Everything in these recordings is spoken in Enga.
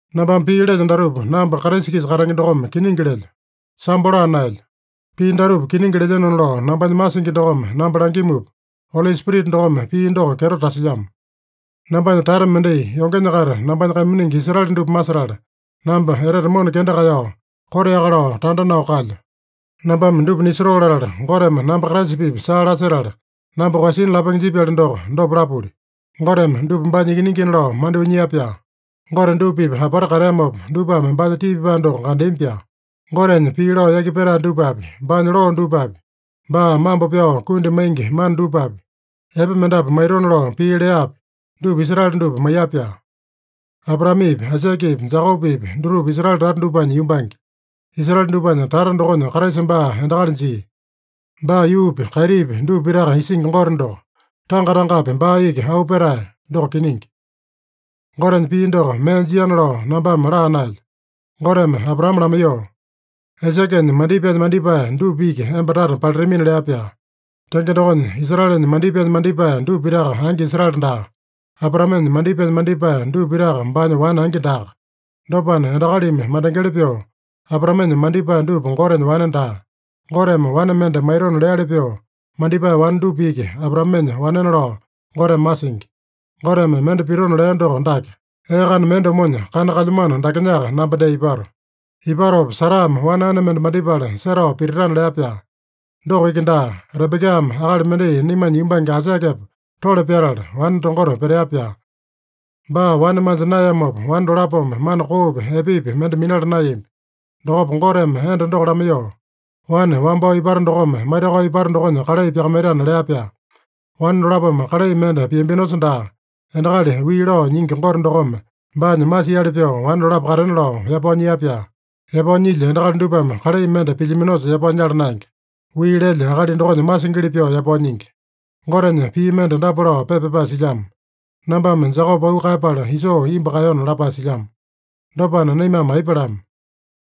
Nambame pii lelyo datupa, namba Kraisa-kisa katenge dokome kiningi lelyo. Sambo laa naelyo. Pii datupa kiningi lelyenona lao nambanya masingi dokome namba langimupa, Oli Spirita dokome pii doko kyeto tasilyamo. Nambanya tata mendai, yongenya-kaita nambanya kaiminingi Israele dupa masetala, namba etete mona kenda kaeyao, koteaka lao tanda nao kalyo. Nambame dupa nisotoo latala, Goteme namba Kraisa-pipa saa lasetala namba koeyasina lapenge jipyali doko, dopa lapuli. Goteme dupa baanya ikiningina lao mandyoo nyia-pyaa. Gote dupa-pipa apata kateamopa, dupame baanya tii pipae doko kandeami-pyaa. Gotenya pii lao yaki petae dupapi, baanya loo dupapi, baa mambo pyao kundi maingi mana dupapi, epe mendapu maitona lao pii leapi, dupa Israele dupa maiya-pyaa. Abraamepi, Aisakepi, Jekopepi dutupa Israele tata dupanya yumbange. Israele dupanya tata dokonya Kraisa baa endakali jia. Baa yuupi, kaitipi dupa pitaka isingi Gote doko. Tanga-tangapi baa iki auu petae! Doko kiningi. Gotenya pii doko mee jiana lao nambame laa naelyo. Goteme Abraame lamaiyoo, “Aisakenya mandipaenya mandipae dupa iki emba tata palitamina” lea-pyaa. Tenge dokonya, Israelenya mandipaenya mandipae dupa pitaka angi Israele daa. Abraamenya mandipaenya mandipae dupa pitaka baanya wane angi daaka. Dopana, endakalimi mandengeli pyoo Abraamenya mandipae dupa Gotenya wane daa. Goteme wane mende maitona leali pyoo mandipae wane dupa iki Abraamenya wanena lao Goteme masingi. Goteme mende pitona lea doko dake: “Ee kana mende omonya, kana kalyamano dakenyaka, namba dee ipato. Ipatopa, Sarame wane ane mende mandipala setao pititana” lea-pyaa. Doko iki daa, Rebekame akali mendai naimanya yumbange Aisakepa tole pyatala, wane tongota petea-pyaa. Baa wane manja naeyamopa wane dolapome mana koopi, epepi mende minala naeyambi. Dokopa Goteme enda doko lamaiyoo, “Wane wambao ipata dokome maitakao ipata dokonya kalai pyakamaitana” lea-pyaa. Wane dolapome kalai mende piambinosa daa, endakali wii lao nyingi Gote dokome baanya masiali pyoo wane dolapo katena lao yapao nyia-pyaa. (Yapao nyilya endakali dupame kalai mende pilyaminosa yapao nyala naenge. Wii lelya akali dokonya masingili pyoo yapao nyingi.) Gotenya pii mende dapa lao pepa pyapae silyamo: “Nambame Jekope auu kaeyapala, Isoo imbu kaeyona” lapae silyamo. Dopana, naimame aipa lama?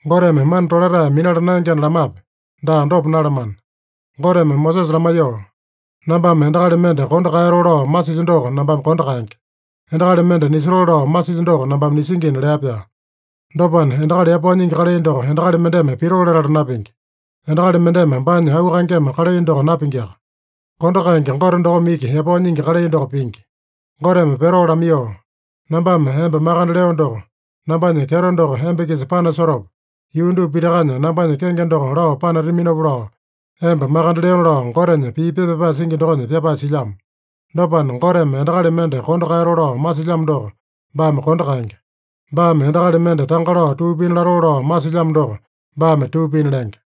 Goteme mana tolatae minala naengena lamape? Daa, dopa nalamana! Goteme Mosesa lamaiyoo, “Nambame endakali mende kondo kaeyatoo lao masilyo doko nambame kondo kaenge. Endakali mende nisotoo lao masilyo doko nambame nisingina” lea-pyaa. Dopana, endakali yapao nyingi kalai doko endakali mendeme pitoo latala napingi. Endakali mendeme baanya auu kaengeme kalai doko napingiaka. Kondo kaenge Gote dokome iki yapao nyingi kalai doko pingi. Goteme Pero lamaiyoo, “Nambame emba makande leo doko, nambanya kyeto doko emba-kisa panasotopa, yuu dupa pitakanya nambanya kenge doko lao panataminopa lao emba makande leona” lao Gotenya pii pepa pyapae singi dokonya pyapae silyamo. Dopana, Goteme endakali mende kondo kaeyatoo lao masilyamo doko, baame kondo kaenge. Baame endakali mende tanga lao tuu pina latoo lao masilyamo doko, baame tuu pina lenge.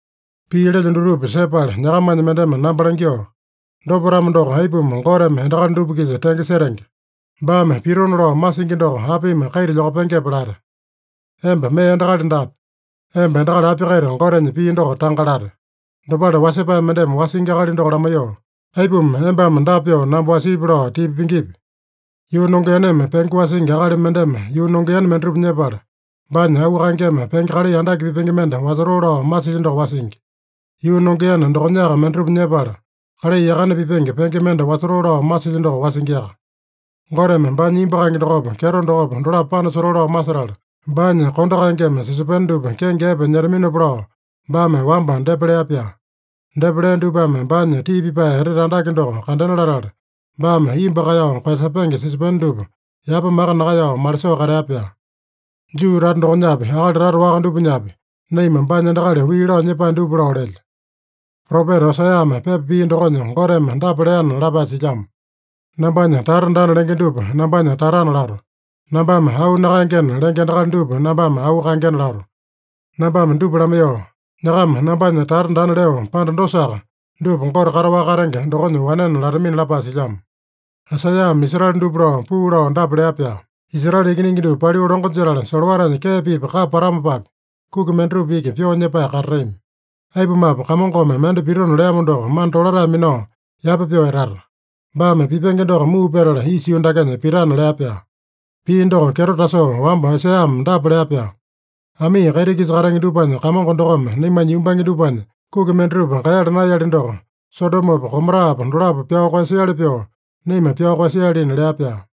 Pii lelyo dutupa sepala nyakamanya mendeme namba langyoo, “Dopa-tamo doko, aipuma Goteme endakali dupa-kisa tenge setenge? Baame pitona lao masingi doko apimi kaita lyokapengepe?” late. Emba mee endakali daape. Emba endakali api-kaita Gotenya pii doko tanga late? Dopale wasepae mendeme wasingi akali doko lamaiyoo, “Aipuma embame dapa pyoo namba wasiipi” lao tipa pingipi? Yuu nongeaneme penge wasingi akali mendeme yuu nongeane mendatupa nyepala, baanya auu kaengeme penge kalai andake pipenge mende wasotoo lao masilya doko wasingi. Yuu nongeane dokonyaka mendatupa nyepala, kalai yakane pipenge penge mende wasotoo lao masilya doko wasingiaka. Goteme baanya imbu kaenge dokopa, kyeto dokopa, dolapo panasotoo lao masetala, baanya kondo kaengeme sisopene dupa kenge epe nyetaminopa lao baame wamba depa lea-pyaa. Depa lea dupame baanya tii pipae etete andake doko kandena latala, baame imbu kaeyao koeyasepenge sisopene dupa yapa maka nakaeyao malisoo katea-pyaa. Juu tata dokonyapi, akali tata waka dupanyapi, naima baanya endakali wii lao nyepae dupa lao lelyo. Propeta Oseame pepa pia dokonya Goteme dapa leana lapae silyamo: “ ‘Nambanya tata daana’ lenge dupa, ‘nambanya tatana’ lato. Nambame ‘auu nakaengena’ lenge endakali dupa, nambame ‘auu kaengena’ lato. Nambame dupa lamaiyoo, ‘Nyakama nambanya tata daana’ leo panda dosaka, dupa ‘Gote kataowaka katenge dokonya wanena’ latamina” lapae silyamo. Aisaiyame Israele dupa lao, puu lao dapa lea-pyaa: “Israele ikiningi dupa paliu longo jetala, solowatanya kee-pipa kapa patamopapi, kuki mendatupa iki pyoo nyepae katatami. Aipumape, Kamongome mende pitona leamo doko mana tolatae minao yapa pyoo etata. Baame pipenge doko muu petala isa yuu dakenya pitana” lea-pyaa. Pii doko kyeto tasoo wamba Aisaiyame dapa lea-pyaa: “Amii kaiti-kisa katenge dupanya Kamongo dokome naimanya yumbange dupanya kuki mendatupa kaeyala naeyali doko, Sodomopa Gomorapa dolapo pyao koeyasiali pyoo, naima pyao koeyasialina” lea-pyaa.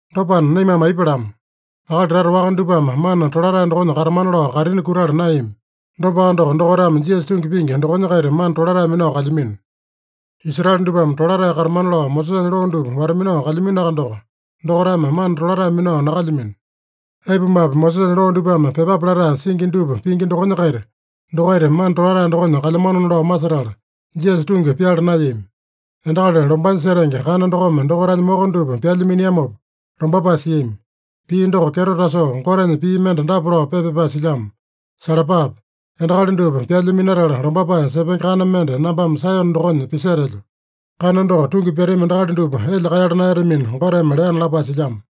Dopana naimame aipa lama? Akali tata waka dupame mana tolatae dokonya katamana lao kaitini kutala naeyami. Dopaka doko, dokaitame Jisasa tungi pingi dokonya-kaita mana tolatae minao kalyamino. Israele dupame tolatae katamana lao Mosesanya loo dupa wata-minao kalyaminoaka doko, dokaitame mana tolatae minao nakalyamino. Aipumape, Mosesanya loo dupame pyepape latae singi dupa pingi dokonya-kaita, dokaita mana tolatae dokonya kalyamanona lao masetala, Jisasa tungi pyala naeyami. Endakali lombanya setenge kana dokome dokaitanya moko dupa pyalya miniamopa lombapae siami. Pii doko kyeto tasoo Gotenya pii mende dapa lao pepa pyapae silyamo: “ ‘Salapape! Endakali dupa pyalya minatala lombapae sepenge kana mende nambame Saeyone dokonya pisetelyo. Kana doko tungi pyatami endakali dupa elya kaeyala naeyatamina’ Goteme leana” lapae silyamo.